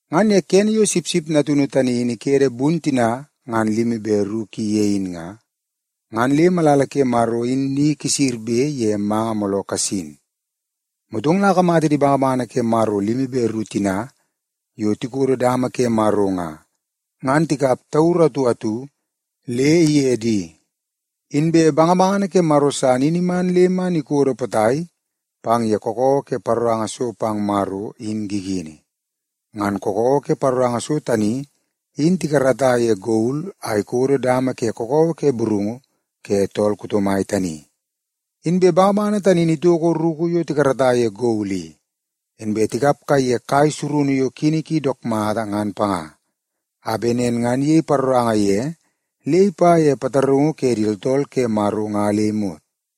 Ngan ye kene yo Sipsip Natunu tani in ikede bun tina ngan limi be ru ki ye in nga, ngan le malala ke Maro in ni kisirbe ye manga mooloo kasin. Motong la akamata di bangabangana ke Maro limi be ru tina yo tikodo dama ke Maro nga, ngan tikap tauru atu atu le ige di. Inbe bangabangana ke Maro san in iman le man ikodo potai pang ye kakawa ke paroranga so pang Maro in gigini. Ngan kakawa ke paroranga so tani in tikarata ye gol a ikodo dama ke kakawa ke burungu ke tool kuto mai tani. Inbe bangabangana tani in itoko ruku yo tikarata ye gol i, inbe tikap kaiye kai surunu yo kini ki dook mata ngan panga, a bet nen ngan iyei paroranga ye le ipa ye pataraungu ke di tooltool ke Maro nga le imot.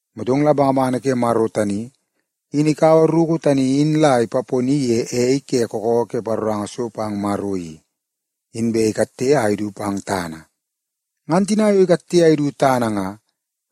Motong la bangabangana ke Maro tani, in ikaua ruku tani in la ipaponi ye ei ke kakawa ke paroranga so pang Maro i, inbe ikatte a idu pang tana. Ngan tina yo ikatte a idu tana nga,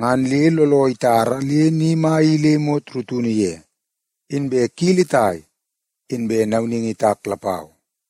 ngan le looloo itara le ni mai i le imot rutunu ye, inbe kili itai, inbe nauningi itak lapau.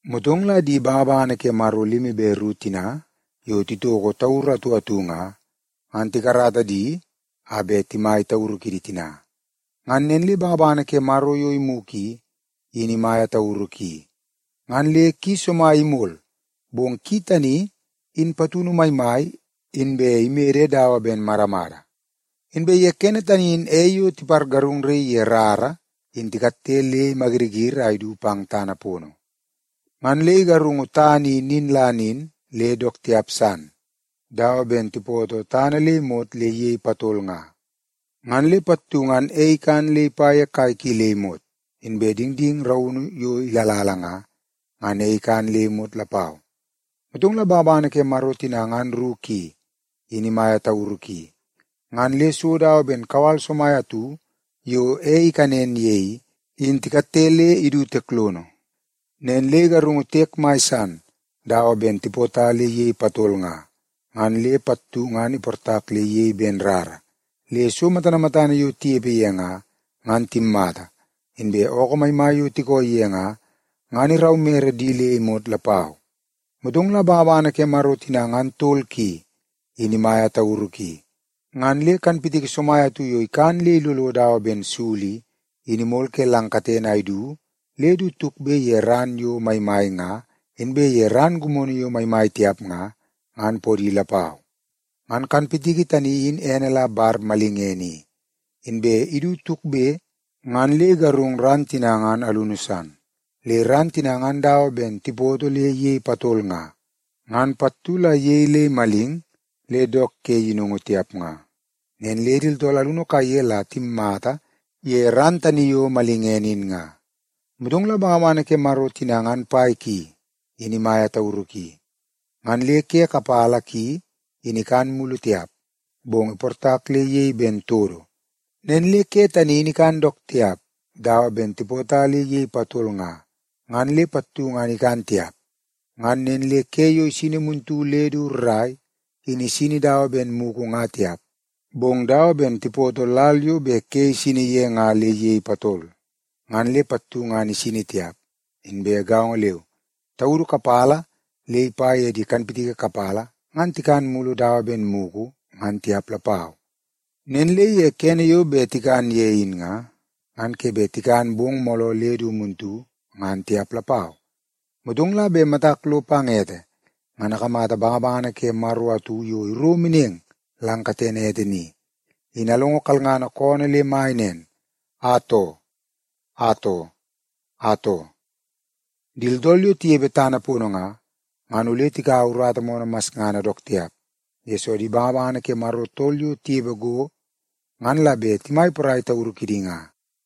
Motong la di bangabangana ke Maro limi be ru tina yo titoko tauru atu atu nga, ngan tikarata di a bet timai tauru kidi tina. Ngan nen le bangabangana ke Maro yo imugu i, in imaia tauru ki, ngan le ki somai imol, bong ki tani in patunu maimai inbe imede dawa ben madamada. Inbe ye kene tani in ei yo tipargarungnaii ye rara in tikatte le imayiriyiri a idu pang tana pono. Ngan le igarungu tana i nin la nin le dook tiap san dawa ben tipoto tana le imot le iyei patol nga, ngan le pattu ngan ei ikan le ipa ye kai ki le imot. Inbe dingding raunu yo ilala nga, ngan ei ikan le imot lapau. Motong la bangabangana ke Maro tina ngan ru ki, in imaia tauru ki, ngan le so dawa ben kawal somai atu yo ei ikanen ye i, in tikatte le idu tiek lono. Nen le igarungu tiek mai san dawa ben tipota le iyei patol nga, ngan le pattu ngan iportak le iyei ben rara, le so matana matana yo tinepe ye nga, ngan timmata, inbe ookoo maimai yo tikooi ye nga, ngan iraumere di le imot lapau. Motong la bangabangana ke Maro tina ngan tol ki, in imaia tauru ki, ngan le kanpitiki somai atu yo ikan le ilolo dawa ben sul i, in imol ke lang katene a idu le du tukbe ye ran yo maimai nga inbe ye ran gimono yo maimai tiap nga, ngan podi lapau. Ngan kanpitiki tani in ene la Bar Malingene i, inbe idu tukbe ngan le igarung ran tina ngan alunu san. Le ran tina ngan dawa ben tipoto le iyei patol nga, ngan pattu la iyei le imaling le dook ke yinungu tiap nga. Nen le di tooltool alunu kaiye la timmata ye ran tani yo malingene in nga. Motong la bangabangana ke Maro tina ngan pai ki, in imaia tauru ki, ngan le ke kapala ki in ikan mulu tiap, bong iportak le iyei ben todo. Nen le ke tani in ikan dook tiap dawa ben tipota le iyei patol nga, ngan le pattu ngan ikan tiap. Ngan nen le ke yo isini muntu le du rrai, in isini dawa ben mugu nga tiap, bong dawa ben tipoto lal yo bet ke isini ye nga le iyei patol, ngan le pattu ngan isini tiap. Inbe gaongo leu, taudu kapala le ipa ye di kanpitiki kapala ngan tikan mulu dawa ben mugu ngan tiap lapau. Nen le kene yo bet tikan ye in nga, ngan ke bet tikan bong mooloo le du muntu ngan tiap lapau. Motong la bet matak lo pang ete, ngan akamata bangabangana ke Maro atu yo iro meneng lang katene ete ni, in alongo kalngana koonoo le mai nen, “Atoo! Atoo! Atoo, di tooltool yo tinepe tana pono nga, ngan ole tikaua urata moonoo masngana dook tiap, yesoo di bangabangana ke Maro tol yo tinepe go ngan la bet timai porai tauru kidi nga.”